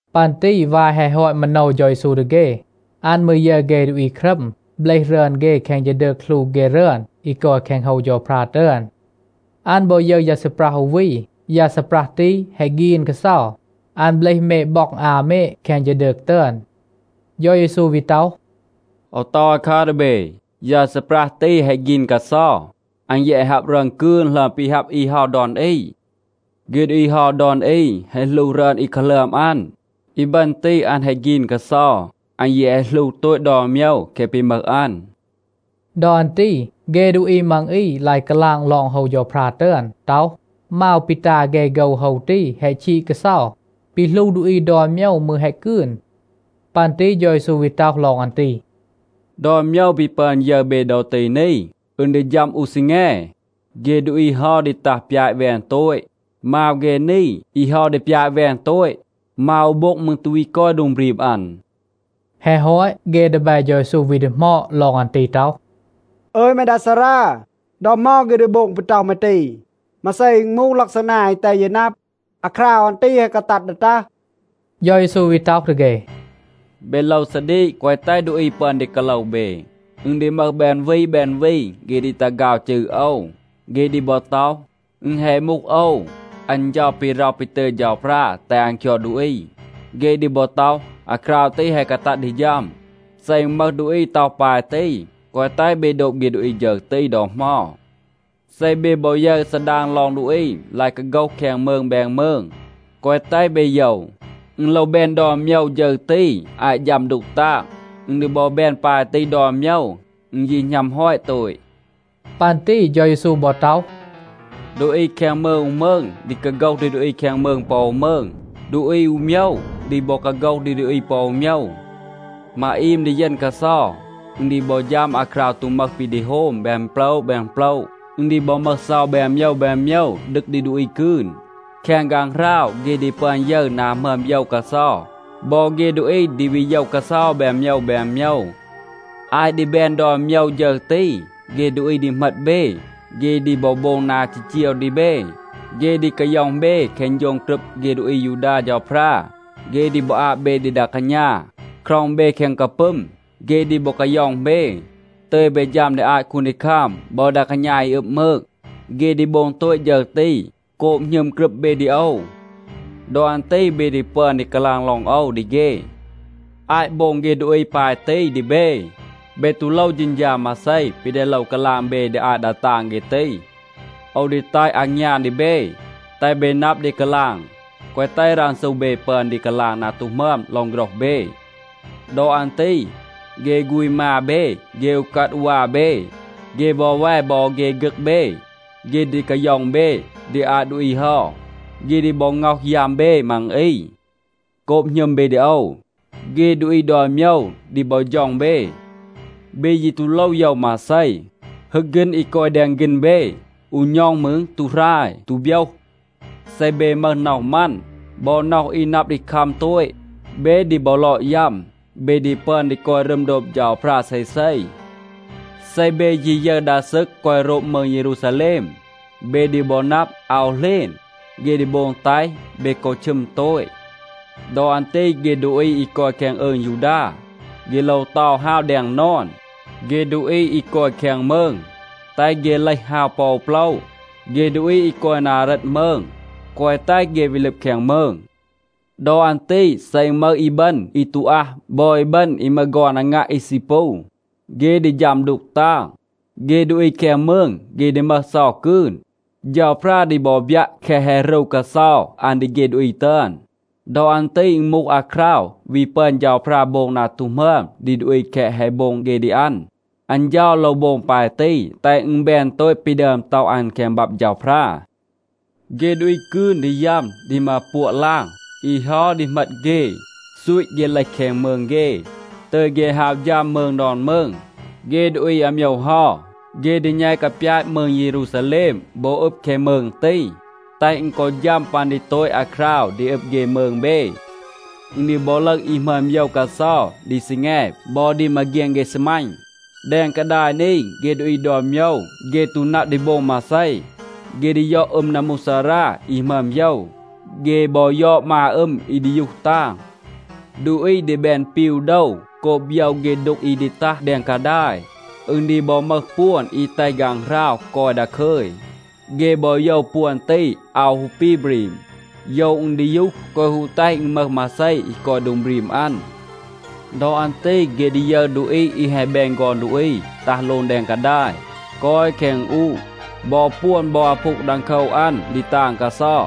ปัน ตี วาย แฮะ ฮอต มาโนว เฌา เยซู ดี เฆ, อัน มืร ยึร เฆ ดูอี ครัม เบลห รึอน เฆ แคง ฌีดืก หลู เฆ รึอน อี กอย แคง โฮว เฌาพรา ตึอน. อัน บอ ยึร ยา ซีปรัห อู วี. ยา ซีปรัห ตี แฮะ ฆีน กาเซา. อัน เบลห เมด บ็อง อา เมด แคง ฌีดืก ตึอน. เฌา เยซู วี ต็อห, “โอว ต็อห อาคัร ดี เบ, ยา ซีปรัห ตี แฮะ ฆีน กาเซา. อัน แยะ แฮะ ฮับ รึอน กืน หลึอม ปี ฮับ อี เฮา ดอน อี. เฆ ดูอี เฮา ดอน อี แฮะ หลู รึอน อี กาหลึอม อัน. อีบึณ ตี, อัน แฮะ ฆีน กาเซา. อัน ยี แฮะ หลู โตต ดอน โมยว แคะ ปี มึห อัน.” ดอ อัน ตี เฆ ดูอี มัง อี ลาย กาลาง ลอง โฮว เฌาพรา ตึอน ต็อห, มาว ปี ตา เฆ โฆว โฮว ตี แฮะ ชีด กาเซา. ปี หลู ดูอี ดอน โมยว, มืร แฮะ กืน. ปัน ตี เฌา เยซู วี ต็อห ลอง อัน ตี, “ดอน โมยว ปี ปึอน ยึร เบ ดอ ตี นี, อึณ ดี ฌัม อู ซีแง, เฆ ดูอี เฮา ดี ตัห ปยาต แวน โตต. มาว เฆ นี, อี เฮา ดี ปยาต แวน โตต. มาว อู โบ็ง มืร ตู วี กอย โดง บรีม อัน.” แฮะ ฮอต, เฆ ดีแบ เฌา เยซู วี ดีหมอด ลอง อัน ตี ต็อห, “อึย แม ดา ซารา, ดอ เหมา เฆ ดี โบง ปี ต็อห แม ตี? มาเซ อึณ มูห ลักซานา อี แตห เย นับ, อาคราว อัน ตี แฮะ กาตัด ดี ตัห?” เฌา เยซู วี ต็อห ดี เฆ, “เบ โลว ซาดีก, แกวะ แตห ดูอี ปึอน ดี กาโลว เบ. อึณ ดี มึห แบน วี แบน วี, เฆ ดี ตัห ฆาว จืร โอว. เฆ ดี บอ ต็อห, ‘อึณ แฮะ มูห โอว, อัน เฌา ปี ร็อห ปี ตึย เฌาพรา แตห อัน คยอด ดูอี.’ เฆ ดี บอ ต็อห, ‘อาคราว ตี แฮะ กาตัด ดี ฌัม.’ เซ อึณ มึห ดูอี ต็อห ปาย ตี, แกวะ แตห เบ โดบ เฆ ดูอี ฌึร ตี ดอ เหมา. เซ เบ บอ ยึร ซาดาง ลอง ดูอี ลาย กาโฆห แคง มืง แบน มืง, แกวะ แตห เบ โยว. อึณ โลว แบน ดอน โมยว ฌึร ตี อาต ฌัม ดูก ตาง. อึณ ดี บอ แบน ปาย ตี ดอน โมยว, อึณ ยี หณัม ฮอต โตต.” ปัน ตี เฌา เยซู บอ ต็อห, “ดูอี แคง มืง อู มืง ดี กาโฆห ดี ดูอี แคง มืง ปอ อู มืง. ดูอี อู โมยว ดี บอ กาโฆห ดี ดูอี ปอ อู โมยว. มาอีม ดีเยณ กาเซา. อึณ ดี บอ ฌัม อาคราว ตู มึห ปี ดี โฮม แบน โปละ แบน โปละ. อึณ ดี บอ มึห เซา แบน โมยว แบน โมยว, ดึก ดี ดูอี กืน. แคง ฆางหราว เฆ ดี ปึอน ยึร นา หมึอม โยว กาเซา, บอ เฆ ดูอี ดี วี โยว กาเซา แบน โมยว แบน โมยว. อาต ดี แบน ดอน โมยว ฌึร ตี, เฆ ดูอี ดี เหมต เบ. เฆ ดี บอ โบง นา จีจีว ดี เบ. เฆ ดี กาย็อง เบ แคง โฌง กรึบ เฆ ดูอี อายูดา เฌาพรา. เฆ ดี บอ อาบ เบ ดี ดา กาณา, คร็อง เบ แคง กาปึม. เฆ ดี บอ กาย็อง เบ, ตึย เบ ฌัม ดี อาต คูนดีคัม บอ ดา กาณา อี อึบ มืง. เฆ ดี โบง โตต ฌึร ตี, โกบ หณึม กรึบ เบ ดี โอว. ดอ อัน ตี เบ ดี ปึอน ดี กาลาง ลอง โอว ดี เฆ. อาต โบง เฆ ดูอี ปาย ตี ดี เบ, เบ ตู โลว เฌณฌา มาเซ ปี ดี โลว กาลาง เบ ดี อาต ดา ตาง เฆ ตี. โอว ดี แตห อางยาน ดี เบ, แตห เบ นับ ดี กาลาง, แกวะ แตห รันซู เบ ปึอน ดี กาลาง นา ตู หมึอม ลอง โฆรห เบ. ดอ อัน ตี เฆ ฆูณ มา เบ, เฆ อูกัด อูวา เบ, เฆ วอแว บอ เฆ ฆึก เบ, เฆ ดี กาย็อง เบ ดี อาต ดูอี เฮา. เฆ ดี บอ ง็อห ยัม เบ มัง อี. โกบ หณึม เบ ดี โอว, เฆ ดูอี ดอน โมยว ดี บอ ฌ็อง เบ. เบ ยี ตู โลว โยว มาเซ. ฮึก ฆีณ อี กอย แดง ฆีณ เบ, อู ณ็อง มืร ตู หราย, ตู โบยห. เซ เบ มึห น็อห มัน บอ น็อห อี นับ ดี คัม โตต, เบ ดี บอ ลอด ยัม, เบ ดี ปึอน ดี กอย รึม โดบ เฌาพรา เซเซ. เซ เบ ยี ยึร ดา ซึก กอย โรบ มืง เยรูซาแลม, เบ ดี บอ นับ, อาว เหลณ, เฆ ดี โบง แตห เบ กอ ชึม โตต. ดอ อัน ตี เฆ ดูอี อี กอย แคง อืง ยูดา, เฆ โลว เตา ฮาว แดง นอน. เฆ ดูอี อี กอย แคง มืง, แตห เฆ เลห ฮาว ปอ อู โปละ. เฆ ดูอี อี กอย นา เรต มืง, แกวะ แตห เฆ วี ลึบ แคง มืง. ดอ อัน ตี เซ อึณ มึห อีบึณ อี ตู อัห บอ อีบึณ อี มึห ฆอน อางัะ อี ซี ปู, เฆ ดี ฌัม ดูก ตาง. เฆ ดูอี แคง มืง, เฆ ดี มึห เซา กืน. เฌาพรา ดี บอ บยัะ แคะ แฮะ รู กาเซา อัน ดี เฆ ดูอี ตึอน. ดอ อัน ตี อึณ มูห อาคราว วี ปึอน เฌาพรา โบง นา ตู หมึอม ดี ดูอี แคะ แฮะ โบง เฆ ดี อัน. อัน เฌา โลว โบง ปาย ตี, แตห อึณ แบน โตต ปี ดึอม ต็อห อัน แคง บับ เฌาพรา. เฆ ดูอี กืน ดี ยัม ดี มา ปัวะ ลาง. อี เฮา ดี เหมต เฆ, ซูต เฆ เลห แคง มืง เฆ, ตึย เฆ ฮาว ฌัม มืง ดอน มืง. เฆ ดูอี อาโมยว เฮา, เฆ ดี แณต กาปยาต มืง เยรูซาแลม บอ อึบ แคง มืง ตี, แตห อึณ กอ ฌัม ปัน ดี โตต อาคราว ดี อึบ เฆ มืง เบ. อึณ ดี บอ ลึห อี หมึอม โยว กาเซา ดี ซีแง บอ ดี มาเฆียน เฆ ซีมัณ. แดง กาดาย นี, เฆ ดูอี ดอน โมยว, เฆ ตู นับ ดี โบง มาเซ. เฆ ดี ยอด อึม นัมมูกซารา อี หมึอม โยว. เฆ บอ ยอด มา อึม อี ดียูห ตาง. ดูอี ดี แบน ปีว โดว โกบ โยว เฆ ดูก อี ดี ตัห แดง กาดาย. อึณ ดี บอ มึห ปวน อี แตห ฆางหราว กอย ดาคึย, เฆ บอ โยว ปวน ตี อาว ฮู ปี บรีม, โยว อึณ ดียูห, แกวะ ฮู แตห อึณ มึห มาเซ อี กอย โดง บรีม อัน. ดอ อัน ตี เฆ ดี ยึร ดูอี อี แฮะ แบน ฆอน ดูอี ตัห โลง แดง กาดาย, กอย แคง อึณอูะ. บอ ปวน บอ อาพูง ดังโคว อัน ดี ตาง กาเซา.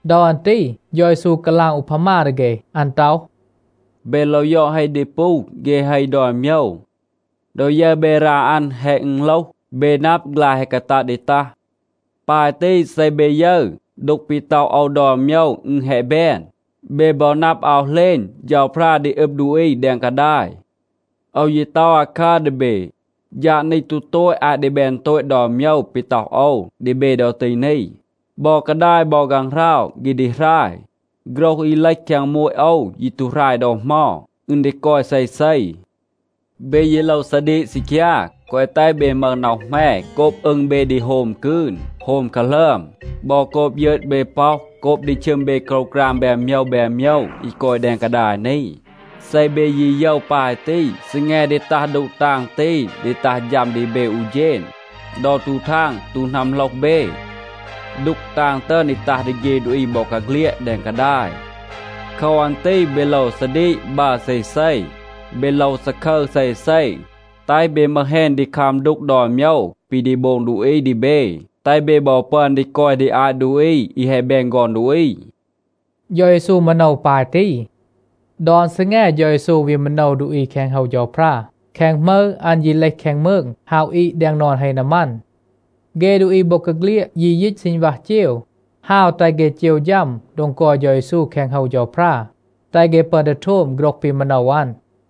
ดอ อัน ตี เฌา เยซู กาลาง อูพามา ดี เฆ. อัน ต็อห, “เบ โลว ยอด เฮ ดีปู เฆ เฮ ดอน โมยว. ดอ ยึร เบ รา อัน แฮะ อึณโลห, เบ นับ, ฆลาย แฮะ กาตัด ดี ตัห. ปาย ตี, เซ เบ ยึร, ดูก ปี ต็อห โอว ดอน โมยว อึณ แฮะ แบน, เบ บอ นับ, อาว เหลณ เฌาพรา ดี อึบ ดูอี แดง กาดาย. โอว ยี ต็อห อาคัร ดี เบ, ฌาด นี ตู โตต อาต ดี แบน โตต ดอน โมยว ปี ต็อห โอว ดี เบ ดอ ตี นี. บอ กาดาย บอ ฆางหราว เฆ ดี หราย. โฆรห อี เลห แคง โมต โอว ยี ตู หราย ดอ เหมา. อึณ ดี กอย เซเซ. เบ ยี โลว ซาดีก ซีคยา, แกวะ แตห เบ มึห น็อห แหม โกบ อึง เบ ดี โฮม กืน, โฮม กาหลึอม, บอ โกบ ยึต เบ ป็อห, โกบ ดี ชึม เบ โกรวกราม แบน โมยว แบน โมยว อี กอย แดง กาดาย นี. เซ เบ ยี โยว ปาย ตี, ซีแง ดี ตัห ดูก ตาง ตี ดี ตัห ฌัม ดี เบ อู เฌณ, ดอ ตู ทาง ตู นัมโหลห เบ. ดูก ตาง ตึอน ดี ตัห ดี เฆ ดูอี บอกาเฆลียด แดง กาดาย. โคว อัน ตี เบ โลว ซาดีก บัร เซเซ. เบ โลว ซาคึร เซเซ, แตห เบ มึห แฮณ ดี คัม ดูก ดอน โมยว ปี ดี โบง ดูอี ดี เบ, แตห เบ บอ ปึอน ดี กอย ดี อาต ดูอี อี แฮะ แบน ฆอน ดูอี.” เฌา เยซู มาโนว ปาย ตี. ดอน ซีแง เฌา เยซู วี มาโนว ดูอี แคง โฮว เฌาพรา. แคง หมึร อัน ยี เลห แคง มืง, ฮาว อีด แดง นอน เฮ นามัน. เฆ ดูอี บอกาเฆลียด ยี ยีต ซีณวัห เจว, ฮาว แตห เฆ เจว ฌัม โดง กอย เฌา เยซู แคง โฮว เฌาพรา, แตห เฆ ปึอน ดี โทม โฆรห ปี มาโนว อัน.